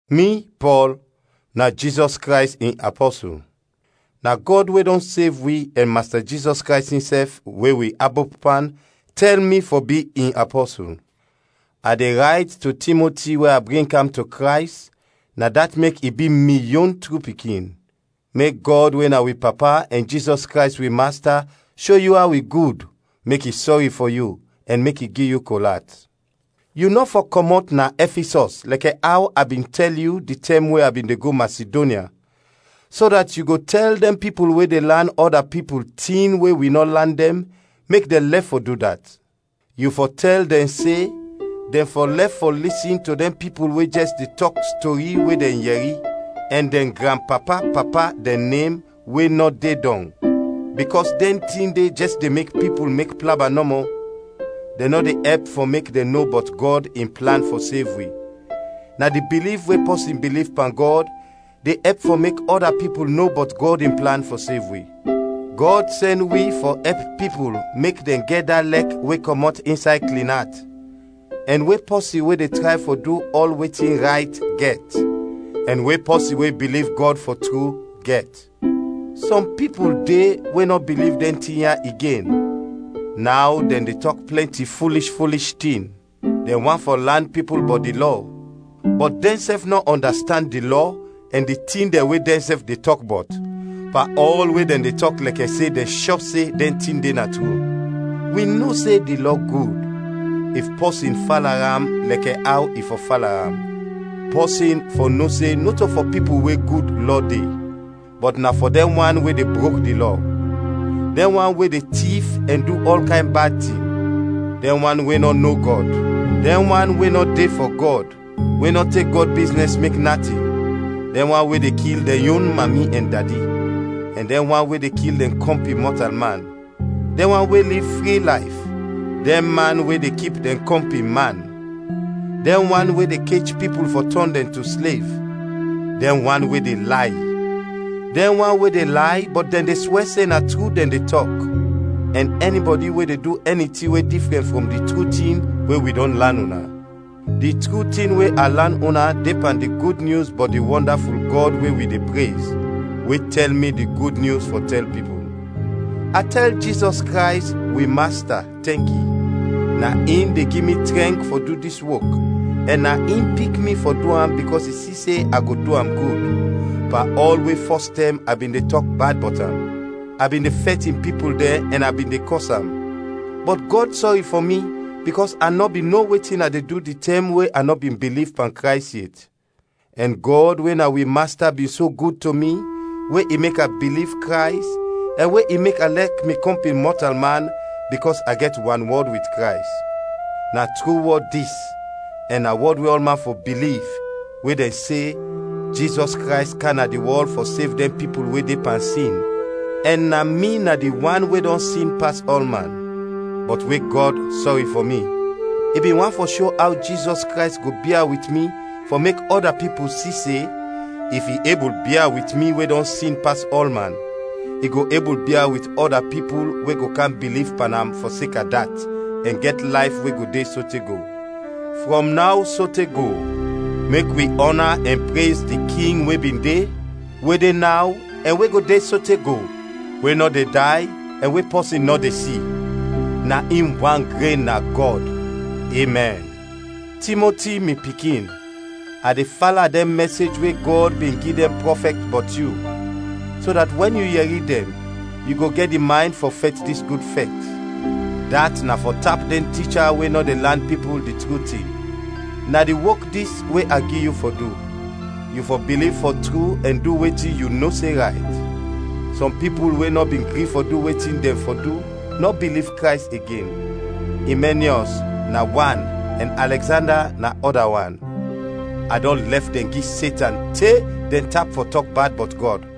Mi, Pɔl, na Jizɔs Krays in apɔsul. Na Gɔd we dɔn sev wi ɛn Masta Jizɔs Krays insɛf, we wi abop pan, tɛl mi fɔ bi in apɔsul. A de rayt to Timoti we a bring kam to Krays, na dat mek i bi mi yon tru pikin: mek Gɔd we na wi Papa ɛn Jizɔs Krays wi Masta sho yu aw i gud, mek i sɔri fɔ yu, ɛn mek i gi yu kol at. Yu nɔ fɔ kɔmɔt na Ɛfisɔs lɛkɛ aw a bin tɛl yu di tɛm we a bin de go Masidonya, so dat yu go tɛl dɛn pipul we de lan ɔda pipul tin we wi nɔ lan dɛn, mek dɛn lɛf fɔ du dat. Yu fɔ tɛl dɛn se dɛn fɔ lɛf fɔ lisin to dɛn pipul we jɛs de tɔk stori we dɛn yɛri, ɛn dɛn granpapa-papa dɛn nem we nɔ de dɔn, bikɔs dɛn tin de jɛs de mek pipul mek plaba nɔmɔ; dɛn nɔ de ɛp fɔ mek dɛn no bɔt Gɔd in plan fɔ sev wi; na di biliv we pɔsin biliv pan Gɔd de ɛp fɔ mek ɔda pipul no bɔt Gɔd in plan fɔ sev wi. Gɔd sɛn wi fɔ ɛp pipul mek dɛn gɛt da lɛk we kɔmɔt insay klin at, ɛn we pɔsin we de tray fɔ du ɔl wetin rayt, gɛt, ɛn we pɔsin we biliv Gɔd fɔ tru, gɛt. Sɔm pipul de we nɔ biliv dɛn tin ya igen, naw dɛn de tɔk plɛnti fulish fulish tin. Dɛn want fɔ lan pipul bɔt di Lɔ, bɔt dɛnsɛf nɔ ɔndastand di Lɔ ɛn di tin dɛn we dɛnsɛf de tɔk bɔt, pan ɔl we dɛn de tɔk lɛkɛ se dɛn shɔ se dɛn tin de na tru. Wi no se di Lɔ gud, if pɔsin fala am lɛkɛ aw i fɔ fala am. Pɔsin fɔ no se nɔto fɔ pipul we gud lɔ de, bɔt na fɔ dɛn wan we de brok di Lɔ, dɛn wan we de tif ɛn du ɔl kayn bad tin, dɛn wan we nɔ no Gɔd; dɛn wan we nɔ de fɔ Gɔd, we nɔ tek Gɔd biznɛs mek natin, dɛn wan we de kil dɛn yon mami ɛn dadi, ɛn dɛn wan we de kil dɛn kɔmpin mɔtalman, dɛn wan we liv fri layf, dɛn man we de kip dɛn kɔmpin man, dɛn wan we de kech pipul fɔ tɔn dɛn to slev, dɛn wan we de lay, dɛn wan we de lay bɔt dɛn de swɛ se na tru dɛn de tɔk, ɛn ɛnibɔdi we de du ɛni tin we difrɛn frɔm di tru tin we wi dɔn lan una. Di tru tin we a lan una de pan di Gud Nyus bɔt di wɔndaful Gɔd we wi de prez, we tɛl mi di Gud Nyus fɔ tɛl pipul. A tɛl Jizɔs Krays, wi Masta, tɛnki. Na in de gi mi trɛnk fɔ du dis wok ɛn na in pik mi fɔ du am bikɔs i si se a go du am gud, pan ɔl we fɔstɛm a bin de tɔk bad bɔt am, a bin de fɛt in pipul dɛn ɛn a bin de kɔs am; bɔt Gɔd sɔri fɔ mi bikɔs a nɔ bin no wetin a de du di tɛm we a nɔ bin biliv pan Krays yet, ɛn Gɔd we na wi Masta bin so gud to mi we i mek a biliv Krays ɛn we i mek a lɛk mi kɔmpin mɔtalman bikɔs a gɛt wanwɔd wit Krays. Na tru wɔd dis ɛn na wɔd we ɔlman fɔ biliv we dɛn se Jizɔs Krays kam na di wɔl fɔ sev dɛn pipul we de pan sin, ɛn na mi na di wan we dɔn sin pas ɔlman. Bɔt we Gɔd sɔri fɔ mi, i bin want fɔ sho aw Jizɔs Krays go bia wit mi fɔ mek ɔda pipul si se, if i ebul bia wit mi we dɔn sin pas ɔlman, i go ebul bia wit ɔda pipul we go kam biliv pan am fɔseka dat ɛn gɛt layf we go de sote go. Frɔm naw sote go mek wi ɔna ɛn prez di King we bin de, we de naw ɛn we go de sote go, we nɔ de day, ɛn we pɔsin nɔ de si; na in wan gren na Gɔd. Emɛn. Timoti, mi pikin, a de fala dɛn mɛsej we Gɔd bin gi dɛn prɔfɛt bɔt yu, so dat wɛn yu yɛri dɛn yu go gɛt di maynd fɔ fɛt dis gud fɛt; dat na fɔ tap dɛn ticha we nɔ de lan pipul di tru tin. Na di wok dis we a gi yu fɔ du. Yu fɔ biliv fɔ tru ɛn du wetin yu no se rayt. Sɔm pipul we nɔ bin gri fɔ du wetin dɛn fɔ du, nɔ biliv Krays igen: Imɛniɔs na wan ɛn Alɛgzanda na ɔda wan; a dɔn lɛf dɛn gi Setan te dɛn tap fɔ tɔk bad bɔt Gɔd.